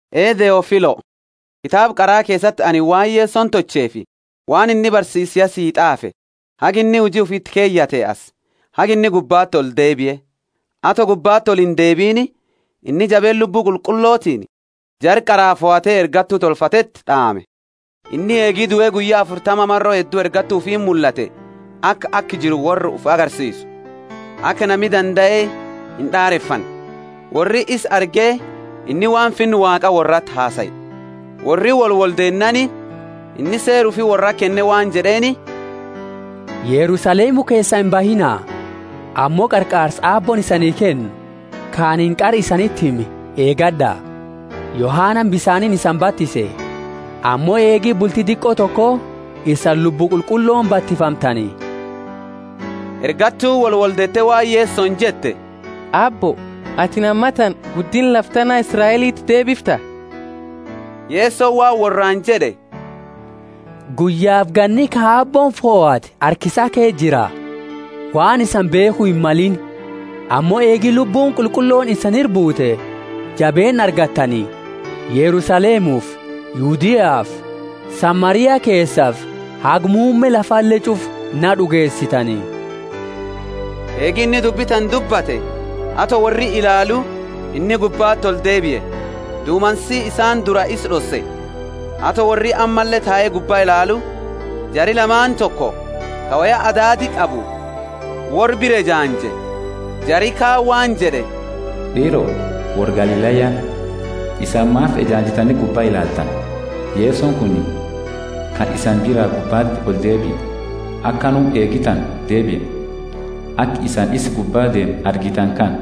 Ee Theofilo kitaaba qara keesati anini waan Yesoni tolcheefi, waan inni barsiise ya sii t'aafe, haga inni huji ufi iti keyate asi, haga inni gubbati oldeebie. Ato gubbati oliindeebiini, inni jabeenna Lubbu Qulqullotiini jara qara fohate ergattu tolfateti d'aame. Inni eegi due guyya afurtama maro heddu ergattu ufiiti mullate aka aka jiru worra ufi agarsiisu, aka nami dandae ind'aarefanne, worri isa arge inni waan Finna Waaqa worrati hasae. Worri woli woldeennaani, inni seera ufi worrati kenne waan jed'eeni, Yerusalemu keesaa imbahiina, ammo qarqaarsa Aabbooni isanii kennu, ka anini qara isaniti hime eegad'a. Yohanani bisaaniini isani batise, ammo eegi bulti diqo toko isani Lubbu Qulqullooni batifamtani. Ergattuuni wolwoldeete waan Yesoni jette Aabbo, atini ammatana guddinna lafa tana Israeliti deebifta? Yesoni waan worraani jed'e, Guyyafi ganni ka Aabbooni fohate harka isaa ke jira, waan isani beekhu himmalini. Ammo eegi Lubbuuni Qulqullooni isani ira buute jabeenna argattani, Yerusalemufi Yudeafi Samaria keesafi haga muumme lafale ch'ufa na d'ugeesitani. Eegi inni dubbi tana dubbate, ato worri ilaalu, inni gubbati oldeebie, dumansi isaani dura isa d'osse. Ato worri ammalle tae gubba ilaalu, jari lamaani toko, ka woya adaadi qabu, worra bira ejaanje. Jari kaani waan jed'e, D'iiro, worra Galilaya, isani maafi ejaanjitani gubba ilaaltani? Yesoni kuni, ka isani bira gubbati oldeebie, akanuma eegi tana deebia, aka isani isa gubba deemu argitani kana.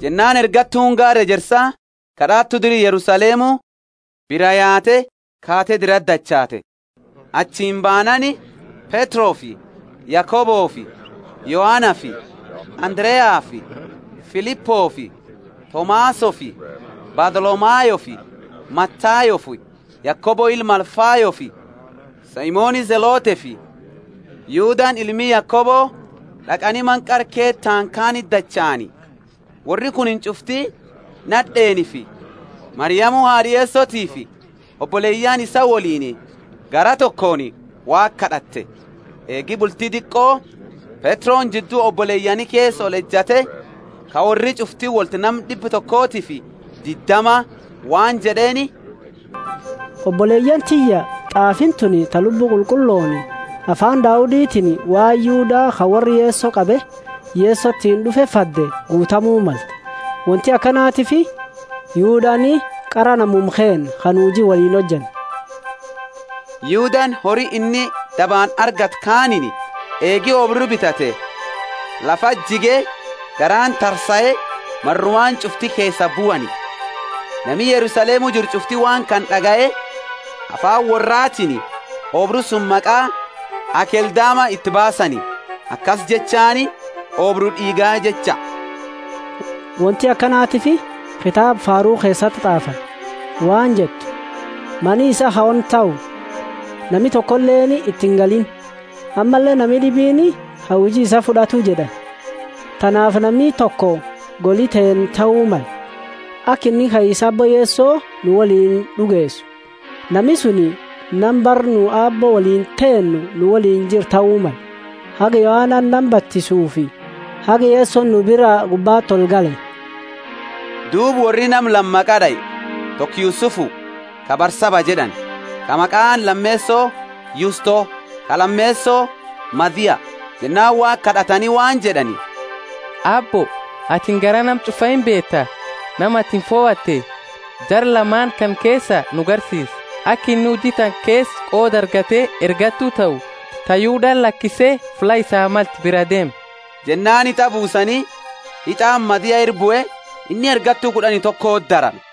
Jennaani ergattuuni gaara ejersa, ka d'aatu dira Yerusalemu, biraa yaate kaate dirati dachaate. Achini baanaani, Petrofi Yakobofi Yohanafi Andareafi Filipofi Tomasofi Bartholomayofi Matayofi Yakobo ilma Alfayofi Simoni Zelotefi Yudani ilmi Yakobo d'aqani mana qara kee taani kaaniti dachaani. Worri kunini ch'ufti nad'eenifi Mariamu haad'a Yesotiifi oboleyaani isaa woliini garaa tokooni Waaqa kad'ate. Eegi bulti diqo, Petroni jiddu oboleyaani keesa olejate (ka worri ch'ufti wolti nama d'ibba tokofi diddama) waan jed'eeni, Oboleyaani tiyya t'aafiini tuni ta Lubbuuni Qulqullooni, afaani Dauditini waan Yuda ka worra Yeso qabe Yesotiini d'ufe fadde guutamu malte. Wonti akanatiifi Yudani qara namuma keenna ka nu huji taka woliini hojanne. (Yudani hori inni dabaani argate kaaniini eegi oobru bitate, lafati jige, garaani tarsae, marumaani ch'ufti keesaa buani. Nami Yerusalemu jiru ch'ufti waan kana d'agaye, afaani worratiini oobru suni maqa Akeldama iti baasani, akasi jechaani oobru d'iiga jecha.) Wonti akanatiifi kitaaba Faaru keesati t'aafani waan jettu, Mani isaa ha ona tahu, nami tokoleeni iti ingaliini. Ammalle nami d'ibiini ha huji isaa fud'atu jed'ani. Tanaafi nami toko goli teenna tahu male, aka inni kaisa Aabbo Yeso nu woliini d'ugeesu, nami suni nama bara nu Aabbo woliini teenne nu woliini jiru tahu male, haga Yohana nama batisutifi haga Yesoni nu bira gubbati olgale. Duuba worri nama lama maqa d'ae; toko Yusufu, ka Barsaba jed'ani, ka maqaani lameeso Yusto; ka lameeso Mathiya. Jennaani Waaqa kad'atani waan jed'ani, Aabbo, atini garaa nama ch'ufa imbeeta. Nama atini fohatte, jara lamaani kana keesa nu garsiisi, aka inni huji tana keesa qooda argate ergattu tahu ta Yudani lakise fulla isaa malte biraa deeme. Jennaani hit'a buusani, hit'aani Mathiya ira bue, inni ergattu kud'ani tokoti darame.